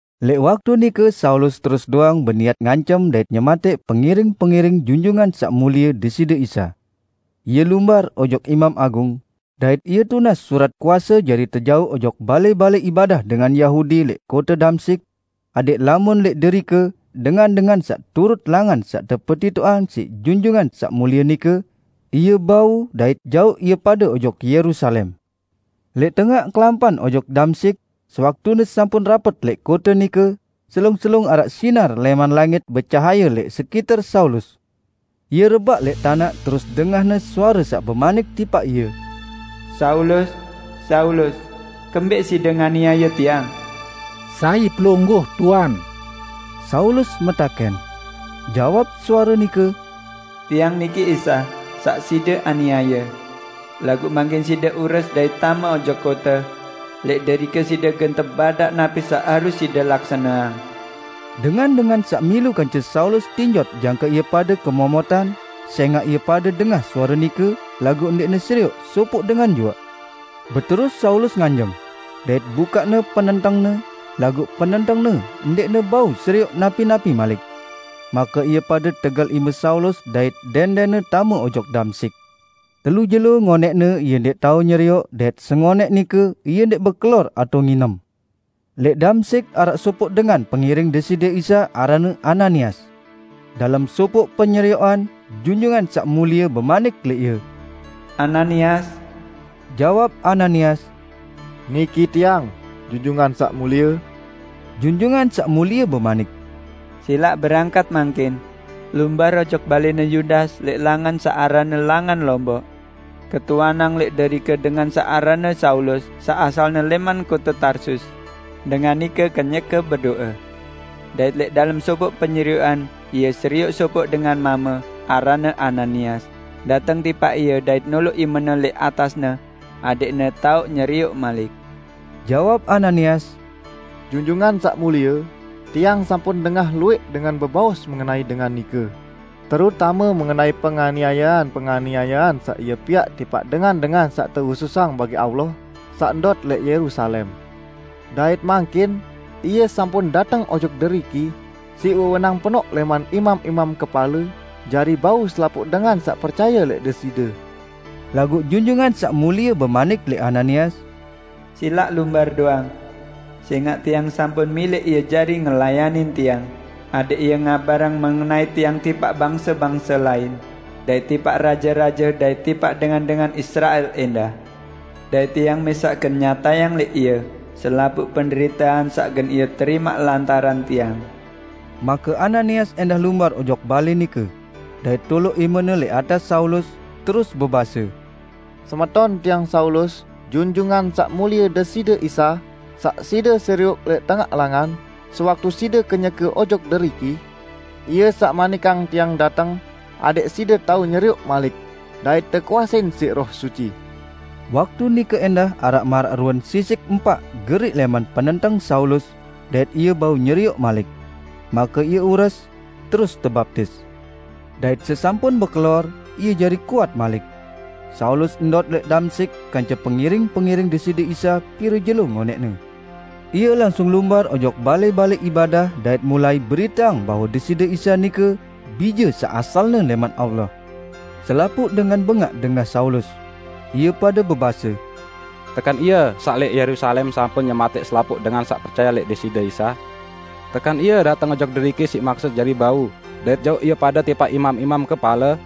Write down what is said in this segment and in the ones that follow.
Lẽq waktu nike Saulus terus doang beniat ngancem dait nyematẽq pengiring-pengiring Junjungan Saq Mulie Deside Isa. Ie lumbar ojok Imam Agung, dait ie tunas surat kuase jari tejauq ojok balẽ-balẽ ibadah dengan Yahudi lẽq kote Damsyik, adẽq lamun lẽq derike ie ndait dengan-dengan saq turut Langan saq tepetitoqang siq Junjungan Saq Mulie nike, ie bau dait jauq ie pade ojok Yerusalem. Lẽq tengaq kelampan ojok Damsyik, sewaktune sampun rapet lẽq kote nike, selung-selung araq sinar lẽman langit becahaye lẽq sekiter Saulus. Ie rebaq lẽq tanaq terus dengahne suare saq bemanik tipaq ie, "Saulus, Saulus! Kembẽq side nganiaye Tiang?" "Sai Pelungguh, Tuan?" Saulus metakẽn. Jawab suare nike, "Tiang niki Isa, saq side aniaye. Laguq mangkin side ures dait tame ojok kote. Lẽq derike side gen tebadaq napi saq harus side laksaneang." Dengan-dengan saq milu kance Saulus tinjot jangke ie pade kemomotan; sẽngaq ie pade dengah suare nike, laguq ndẽqne serioq sopoq dengan juaq. Beterus Saulus nganjeng, dait bukaqne penentengne, laguq penentengne ndẽqne bau serioq napi-napi malik. Make ie pade tegel ime Saulus dait dẽndẽnne tame ojok Damsyik. Telu jelo ngonẽqne ie ndẽq tao nyerioq dait sengonẽq nike ie ndẽq bekelor atao nginem. Lẽq Damsyik araq sopoq dengan pengiring Deside Isa aranne Ananias. Dalem sopoq penyerioqan, Junjungan Saq Mulie bemanik lẽq ie, "Ananias!" Jawab Ananias, "Niki tiang, Junjungan Saq Mulie." Junjungan Saq Mulie bemanik, "Silaq berangkat mangkin. Lumbar ojok balẽne Yudas lẽq langan saq aranne Langan Lomboq. Ketuanang lẽq derike dengan saq aranne Saulus saq asalne lẽman kote Tarsus. Dengan nike kenyeke bedo'e, dait lẽq dalem sopoq penyerioqan ie serioq sopoq dengan mame, aranne Ananias, dateng tipaq ie dait noloq imene lẽq atasne adẽqne tao nyerioq malik." Jawab Ananias, "Junjungan Saq Mulie, tiang sampun dengah luwẽq dengan bebaos mengenai dengan nike, terutame mengenai penganiayean-penganiayean saq ie piaq tipaq dengan-dengan saq tehususang bagi Allah saq ndot lẽq Yerusalem. Dait mangkin ie sampun dateng ojok deriki siq wewenang penoq lẽman imam-imam kepale jari bau selapuq dengan saq percaye lẽq Deside." Laguq Junjungan Saq Mulie bemanik lẽq Ananias, "Silaq lumbar doang! Sẽngaq Tiang sampun milẽq ie jari ngelayanin Tiang, adẽq ie ngabarang mengenai Tiang tipaq bangse-bangse lain dait tipaq raje-raje dait tipaq dengan-dengan Israel ẽndah. Dait Tiang mẽsaq gen nyatayang lẽq ie selapuq penderitean saq gen ie terimaq lantaran Tiang." Make Ananias ẽndah lumbar ojok balẽ nike, dait toloq imene lẽq atas Saulus, terus bebase, "Semeton tiang Saulus, Junjungan Saq Mulie Deside Isa saq side serioq lẽq tengaq langan sewaktu side kenyeke ojok deriki, Ie saq manikang tiang dateng adẽq side tao nyerioq malik, dait tekuasein siq Roh Suci." Waktu nike ẽndah araq maraq ruen sisik empaq geriq lẽman penenteng Saulus, dait ie bau nyerioq malik. Make ie ures, terus tebaptis. Dait sesampun bekelor, ie jari kuat malik. Saulus ndot lẽq Damsyik kance pengiring-pengiring Deside Isa pire jelo ngonẽqne. Ie langsung lumbar ojok balẽ-balẽ ibadah dait mulai beriteang bahwe Deside Isa nike Bije saq asalne lẽman Allah. Selapuq dengan bengaq dengah Saulus. Ie pade bebase, "Tekan ie saq lẽq Yerusalem sampun nyematẽq selapuq dengan saq percaye lẽq Deside Isa? Tekan ie dateng ojok deriki siq maksut jari bau dait jauq ie pade tipaq imam-imam kepale?"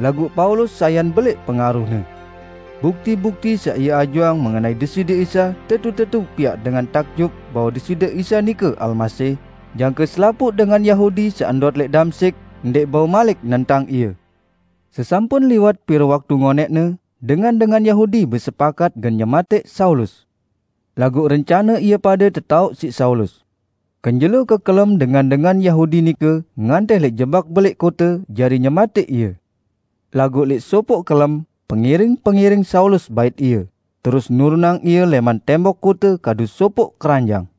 Laguq Saulus sayan belẽq pengaruhne. Bukti-bukti saq ie ajuang mengenai Deside Isa tetu-tetu piaq dengan takjub bahwe Deside Isa nike Almasih, jangke selapuq dengan Yahudi saq ndot lẽq Damsyik ndẽq bau malik nentang ie. Sesampun liwat pire waktu ngonẽqne, dengan-dengan Yahudi besepakat gen nyematẽq Saulus. Laguq rencane ie pade tetaoq siq Saulus. Kenjelo kekelem dengan-dengan Yahudi nike ngantih lẽq jebak belẽq kote jari nyematẽq ie. Laguq lẽq sopoq kelem, pengiring-pengiring Saulus bait ie, terus nurunang ie lẽman tembok kote kadu sopoq keranjang.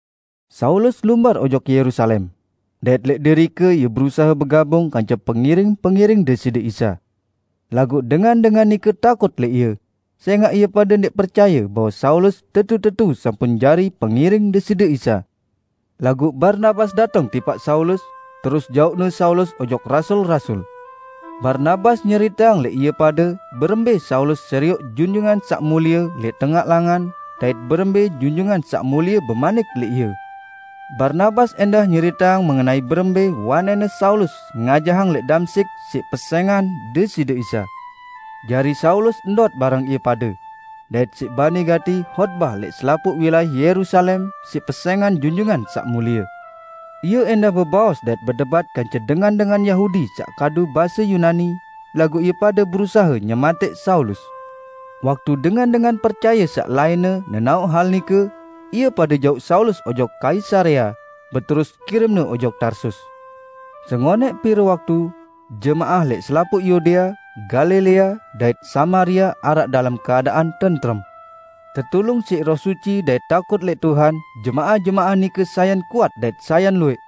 Saulus lumbar ojok Yerusalem, dait lẽq derike ie berusahe begabung kance pengiring-pengiring Deside Isa. Laguq dengan-dengan nike takut lẽq ie, sẽngaq ie pade ndẽq percaye bahwe Saulus tetu-tetu sampun jari pengiring Deside Isa. Laguq Barnabas dateng tipaq Saulus, terus jauqne Saulus ojok rasul-rasul. Barnabas nyeriteang lẽq ie pade berembẽ Saulus serioq Junjungan Saq Mulie lẽq tengaq langan, dait berembẽ Junjungan Saq Mulie bemanik lẽq ie. Barnabas ẽndah nyeriteang mengenai berembẽ wanẽnne Saulus ngajahang lẽq Damsyik siq pesẽngan Deside Isa. Jari Saulus ndot bareng ie pade, dait siq bani gati hotbah lẽq selapuq wilayah Yerusalem siq pesẽngan Junjungan Saq Mulie. Ie ẽndah bebaos dait bedebat kance dengan-dengan Yahudi saq kadu base Yunani, laguq ie pade berusahe nyematẽq Saulus. Waktu dengan-dengan percaye saq lainne nenaoq hal nike, ie pade jauq Saulus ojok Kaisarea, beterus kirimne ojok Tarsus. Sengonẽq pire waktu, jemaah lẽq selapuq Yudea, Galilea, dait Samaria araq dalem keadaan tentrem. Tetulung siq Roh Suci dait takut lẽq Tuhan, jemaah-jemaah nike sayan kuat dait sayan luwẽq.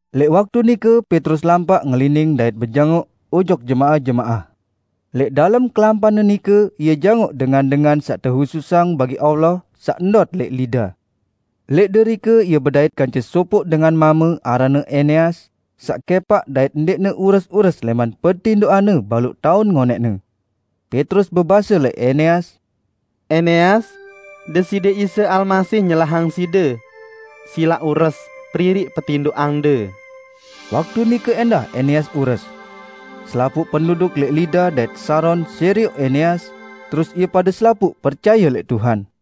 Lẽq waktu nike Petrus lampaq ngelining dait bejangoq ojok jemaah-jemaah. Lẽq dalem kelampanne nike ie jangoq dengan-dengan saq tehususang bagi Allah saq ndot lẽq Lida. Lẽq derike ie bedait kance sopoq dengan mame aranne Eneas, saq kẽpaq dait ndẽqne ures-ures lẽman petindoqanne baluq taun ngonẽqne. Petrus bebase lẽq Eneas, "Eneas, Deside Isa Almasih nyelahang side. Silaq ures, periri petindoqande." Waktu nike ẽndah Eneas ures. Selapuq penduduk lẽq Lida dait Saron serioq Eneas, terus ie pade selapuq percaye lẽq Tuhan.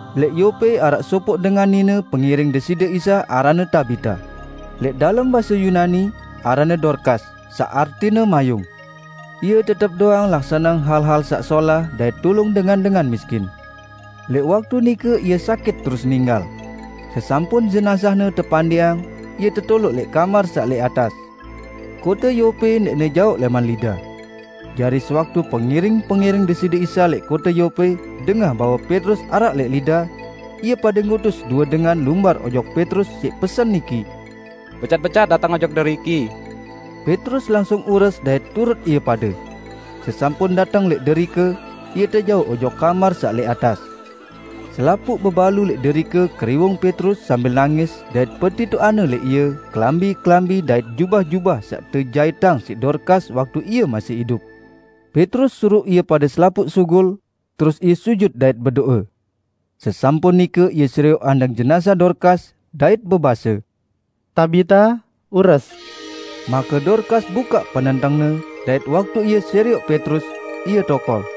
Lẽq Yope araq sopoq dengan nine pengiring Deside Isa aranne Tabita. (Lẽq dalem base Yunani, aranne Dorkas saq artine mayung.) Ie tetep doang laksaneang hal-hal saq solah dait tulung dengan-dengan miskin. Lẽq waktu nike ie sakit terus ninggal. Sesampun jenazahne tepandiqang, ie tetoloq lẽq kamar saq lẽq atas. Kote Yope ndẽqne jaoq lẽman Lida. Jari sewaktu pengiring-pengiring Deside Isa lẽq kote Yope dengah bahwe Petrus araq lẽq Lida, ie pade ngutus due dengan lumbar ojok Petrus siq pesen niki, "Becat-becat dateng ojok deriki." Petrus langsung ures dait turut ie pade. Sesampun dateng lẽq derike, ie tejauq ojok kamar saq lẽq atas. Selapuq bebalu lẽq derike keriwung Petrus sambil nangis dait petitoqangne lẽq ie kelambi-kelambi dait jubah-jubah saq tejaitang siq Dorkas waktu ie masih idup. Petrus suruq ie pade selapuq sugul, terus ie sujut dait bedo'e. Sesampun nike ie serioq andang jenazah Dorkas, dait bebase, "Tabita, ures!" Make Dorkas bukaq penentengne, dait waktu ie serioq Petrus, ie tokol.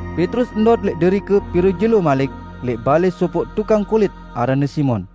Petrus ndot lẽq derike pire jelo malik lẽq balẽ sopoq tukang kulit aranne Simon.